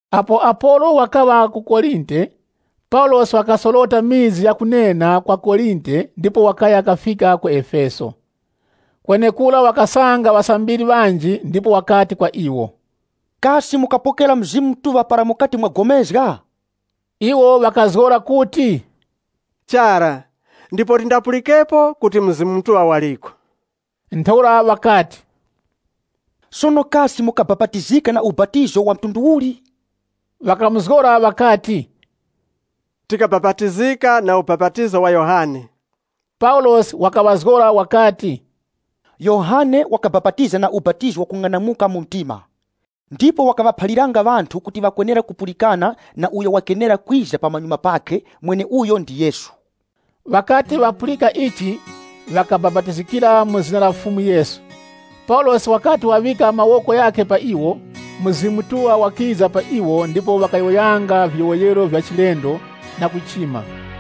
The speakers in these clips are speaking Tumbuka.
Apo Apolo wakaŵa ku Korinte, Paulosi wakasorota mizi ya kunena kwa Korinte ndipo wakaya kafika ku Efeso. Kwenekura wakasanga ŵasambiri ŵanji, ndipo wakati kwa iwo, “Kasi mukapokera Mzimu Mutuŵa para mukati mwapulikana?” Iwo ŵakazgora kuti, “Chara, ndipo tindapulikepo kuti Mzimu Mutuŵa waliko.” Ntheura wakati, “Sono kasi mukabapatizika na ubapatizo wa mtundu uli?” Ŵakamuzgora ŵakati, “Tikabapatizika na ubapatizo wa Yohane.” Paulosi wakaŵazgora wakati, “Yohane wakabapatiza na ubapatizo wakung'anamuka mu mtima. Ndipo wakaŵaphaliranga ŵanthu kuti ŵakwenera kupulikana na uyo wakenera kwiza pamanyuma pakhe, mweneuyo ndi Yesu.” Ŵakati ŵapulika ichi ŵakabapatizikira mu zina la Fumu Yesu. Paulosi wakati waŵika mawoko ghakhe pa iwo, Mzimu Mutuŵa wakiza pa iwo ndipo ŵakayowoyanga viyowoyero vya chilendo na kuchima.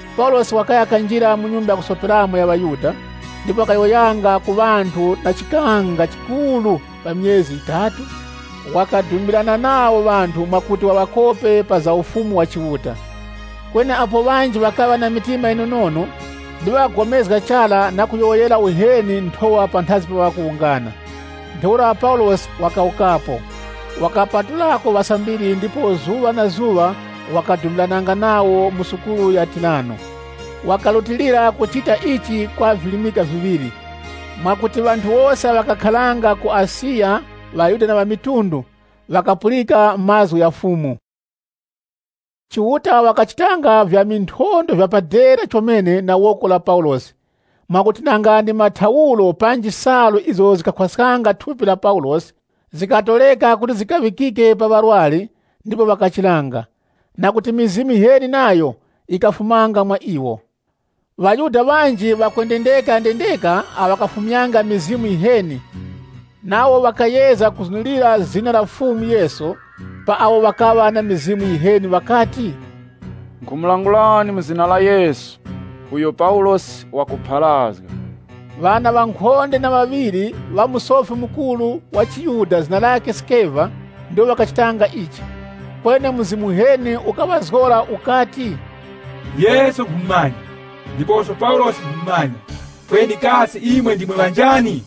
Paulosi wakaya kanjira mu nyumba ya kusoperamo ya ŵaYuda, ndipo wakayowoyanga ku ŵanthu na chikanga chikuru pa myezi yitatu, wakudumbirana nawo ŵanthu mwakuti waŵakope pa za Ufumu wa Chiuta Kweni apo ŵanji ŵakaŵa na mitima yinonono, ndipo ŵakagomezga chara na kuyowoyera uheni Nthowa panthazi pa mpingo, Paulosi wakawukapo. Wakapatulako ŵasambiri ndipo zuŵa na zuŵa wakadumbirananga nawo mu sukulu ya Tirano. Wakarutilira kuchita ichi kwa virimika viŵiri, mwakuti ŵanthu wose awo ŵakakharanga ku Asiya, ŵaYuda na ŵamitundu, ŵakapulika mazgu gha Fumu. Chiuta wakachitanga vya minthondwe vya pa dera chomene na woko la Paulosi, mwakuti nanga ndi mathauro panji salu izo zikakhwaskanga thupi la Paulosi zikatoreka kuti zikaŵikike pa ŵarwari, ndipo ŵakachiranga, na kuti mizimu yiheni nayo yikafumanga mwa iwo. ŴaYuda ŵanji ŵakwendendeka, awo ŵakafumyanga mizimu yiheni, nawo wakayezga kuzunurira zina la Fumu Yesu, pa awo ŵakaŵa na mizimu yiheni ŵakati, “Nkhumulangulani mu zina la Yesu uyo Paulosi wakupharazga.” Ŵana ŵankhonde na ŵaŵiri ŵa Musofi Mukuru wa chiYuda zina lakhe Sikeva, ndiwo ŵakachitanga ichi. Kweni mzimu uheni ukaŵazgora ukati, “Yesu nkhumumanya, ndiposo Paulosi nkhumumanya, kweni kasi imwe ndimwe ŵanjani.”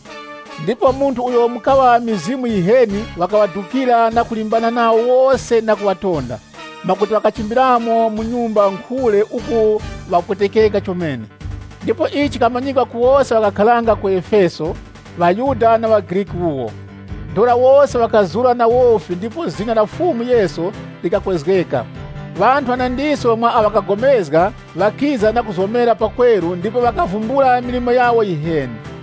Ndipo munthu uyo mukaŵa mizimu yiheni wakaŵadukira na kulimbana nawo wose na kuŵatonda, mwakuti ŵakachimbiramo mu nyumba nkhule uku ŵapwetekeka chomene. Ndipo ichi chikamanyikwa ku wose awo ŵakakharanga ku Efeso, ŵaYuda na ŵaGriki wuwo. Ntheura wose ŵakazura na wofi ndipo zina la Fumu Yesu likakwezgeka. Ŵanthu ŵanandiso mwa awo ŵakapulikana ŵakiza na kuzomera pakweru ndipo ŵakavumbula milimo yawo yiheni.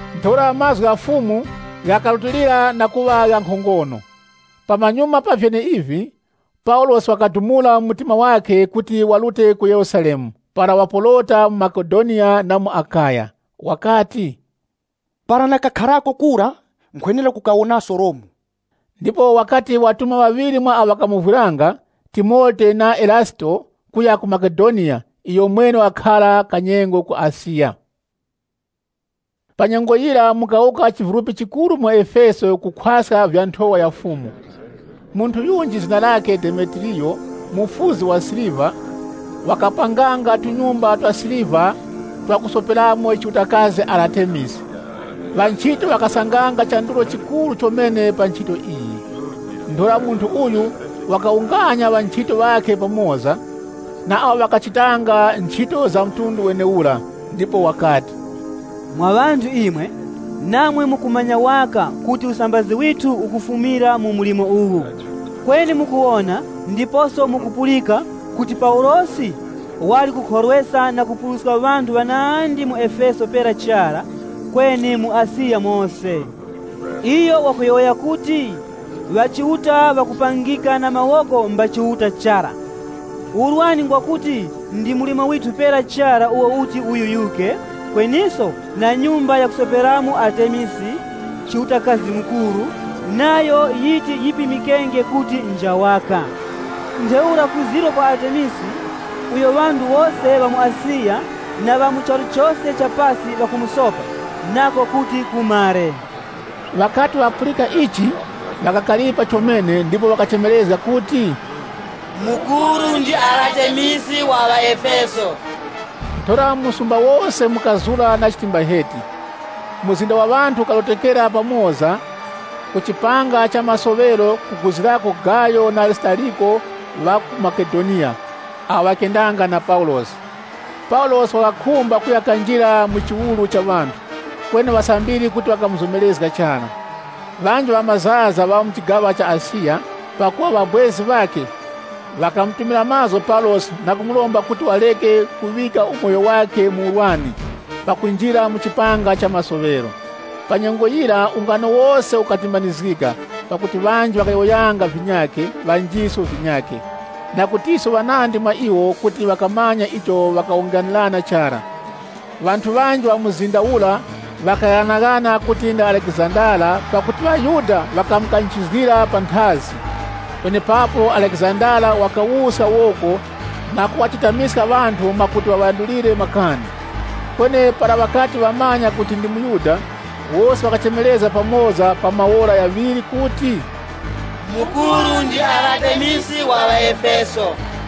Ntheura mazgu gha Fumu ghakarutilira na kuŵa gha nkhongono. Pamanyuma pa vyeneivi, Paulosi wakadumula, wati wazuzgika na Mzimu Mutuŵa, kuti warute ku Yerusalemu para waporota mu Makedoniya na mu Akaya. Iyo wakati, “Para nakakharako kura, nkhwenera kukawonaso Romu.” Ndipo wakati watuma ŵaŵiri mwa awo ŵakamovwiranga, Timote na Erasito, kuya ku Makedoniya, iyomwene wakakhara kanyengo ku Asiya. Panyengo yira mukawuka chivulupi chikuru mu Efeso kukhwaska vya Nthowa ya Fumu. Munthu yunji zina lakhe Demetiriyo, mufuzi wa siliva, wakapanganga tunyumba twa siliva twa kusoperamo chiutakazi Aratemisi. Ŵanchito ŵakasanganga chandulo chikuru chomene pa nchito iyi. Ntheura munthu uyu wakawunganya ŵanchito ŵakhe pamoza, na awo ŵakachitanga nchito za mtundu wenewura, ndipo wakati, “Mwa ŵanthu imwe, namwe mukumanya waka kuti usambazi withu ukufumira mu mlimo uwu. Kweni mukuwona ndiposo mukupulika kuti Paulosi wali kukhorweska na kupuruska ŵanthu ŵanandi mu Efeso pera chara, kweni mu Asiya mose. Iyo wakuti ŵachiuta ŵakupangika na mawoko mba chiuta chara. Urwani ngwa kuti ndi mlimo withu pera chara uwo uti uyuyuke, kweniso na nyumba ya chiutakazi mukuru, Aratemisi, nayo yiti yipimikenge kuti nja waka. Ntheura kuzirwa kwa Aratemisi, uyo ŵanthu wose ŵa mu Asiya, na ŵa mu charu chose cha pasi ŵakumusopa, nako kuti kumare.” Ŵakati ŵapulika ichi, ŵakakaripa chomene, ndipo ŵakachemerezga kuti, “Mukuru ndi Aratemisi wa ŵaEfeso!” Ntheura mu msumba wose mukazura na chitimbaheti. Mzinda wa ŵanthu ukarotokera pamoza ku chipanga cha masoŵero kuguzirako Gayo na Arisitariko ŵa ku Makedoniya, awo ŵakendanga na Paulosi. Paulosi wakakhumba kuya kanjira mu chiwuru cha ŵanthu, kweni ŵasambiri kuti ŵakamuzomerezga chara. Ŵanji ŵamazaza ŵa mu chigaŵa cha Asiya, pakuŵa ŵabwezi ŵakhe, ŵakamutumira mazgu Paulosi na kumuromba kuti wareke kuŵika umoyo wakhe mu urwani pakunjira mu chipanga cha masoŵero. Pa nyengo yira ungano wose ukatimbanizgika pakuti ŵanji ŵakayowoyanga vinyakhe, ŵanjiso vinyakhe. Na kutiso ŵanandi mwa iwo kuti ŵakamanya icho ŵakawunganirana chara. Ŵanthu ŵanji ŵa mzinda ura ŵakaghanaghana kuti ndi Alekizandara, pakuti ŵaYuda ŵakamukanchizgira panthazi. Penepapo Alekizandara wakawuska woko na kuŵachetamiska ŵanthu mwakuti waŵandulire makani. Kweni para ŵakati ŵamumanya kuti ndi muYuda, wose ŵakachemerezga pamoza pa maora ghaŵiri kuti, “Mukuru ndi Aratemisi wa ŵaEfeso.”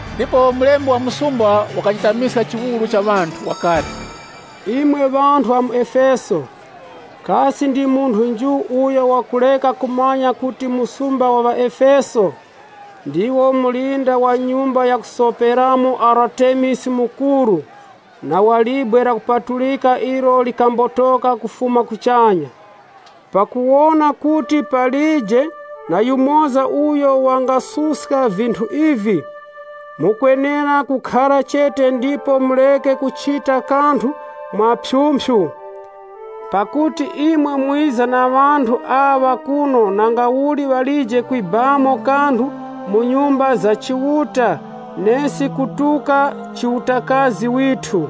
Ndipo, mulembi wa msumba wakachetamiska chiwuru cha ŵanthu, wakati, “Imwe ŵanthu ŵa mu Efeso, kasi ndi munthu nju uyo wakureka kumanya kuti muzi wa ŵaEfeso ndiwo mulinda wa nyumba ya chiutakazi mukuru, Aratemisi na wa libwe lakupatulika ilo likambotoka kufuma kuchanya. Pakuwona kuti palije na yumoza uyo wangasuska vinthu ivi, mukwenera kukhara chete ndipo mureke kuchita kanthu mwa phyumphyu, pakuti imwe mwiza na ŵanthu aŵa kuno nangauli ŵalije kwibamo kanthu mu nyumba za chiuta nesi kutuka chiutakazi withu.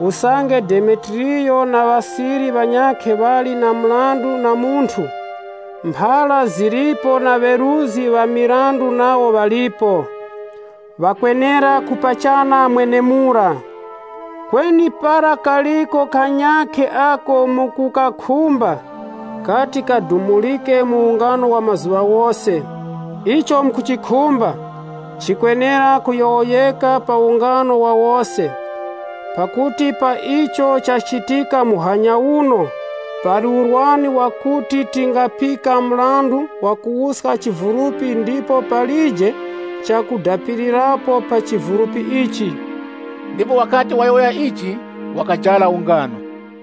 Usange Demetiriyo na ŵasiri ŵanyakhe ŵali na mrandu na munthu, mphara zilipo na ŵeruzgi ŵa mirandu nawo ŵalipo. Ŵakwenera kupachana mwenemura. Kweni para kaliko kanyakhe ako mukukakhumba, kati kadumurike mu ungano wa mazuŵa ghose. Icho mukuchikhumba, chikwenera kuyowoyeka pa ungano wa wose. Pakuti pa icho chachitika muhanya uno, pali urwani wakuti tingapika mrandu wakuwuska chivulupi ndipo palije chakudapirirapo pa chivulupi ichi.” Ndipo wakati wayowoya ichi, wakajara ungano.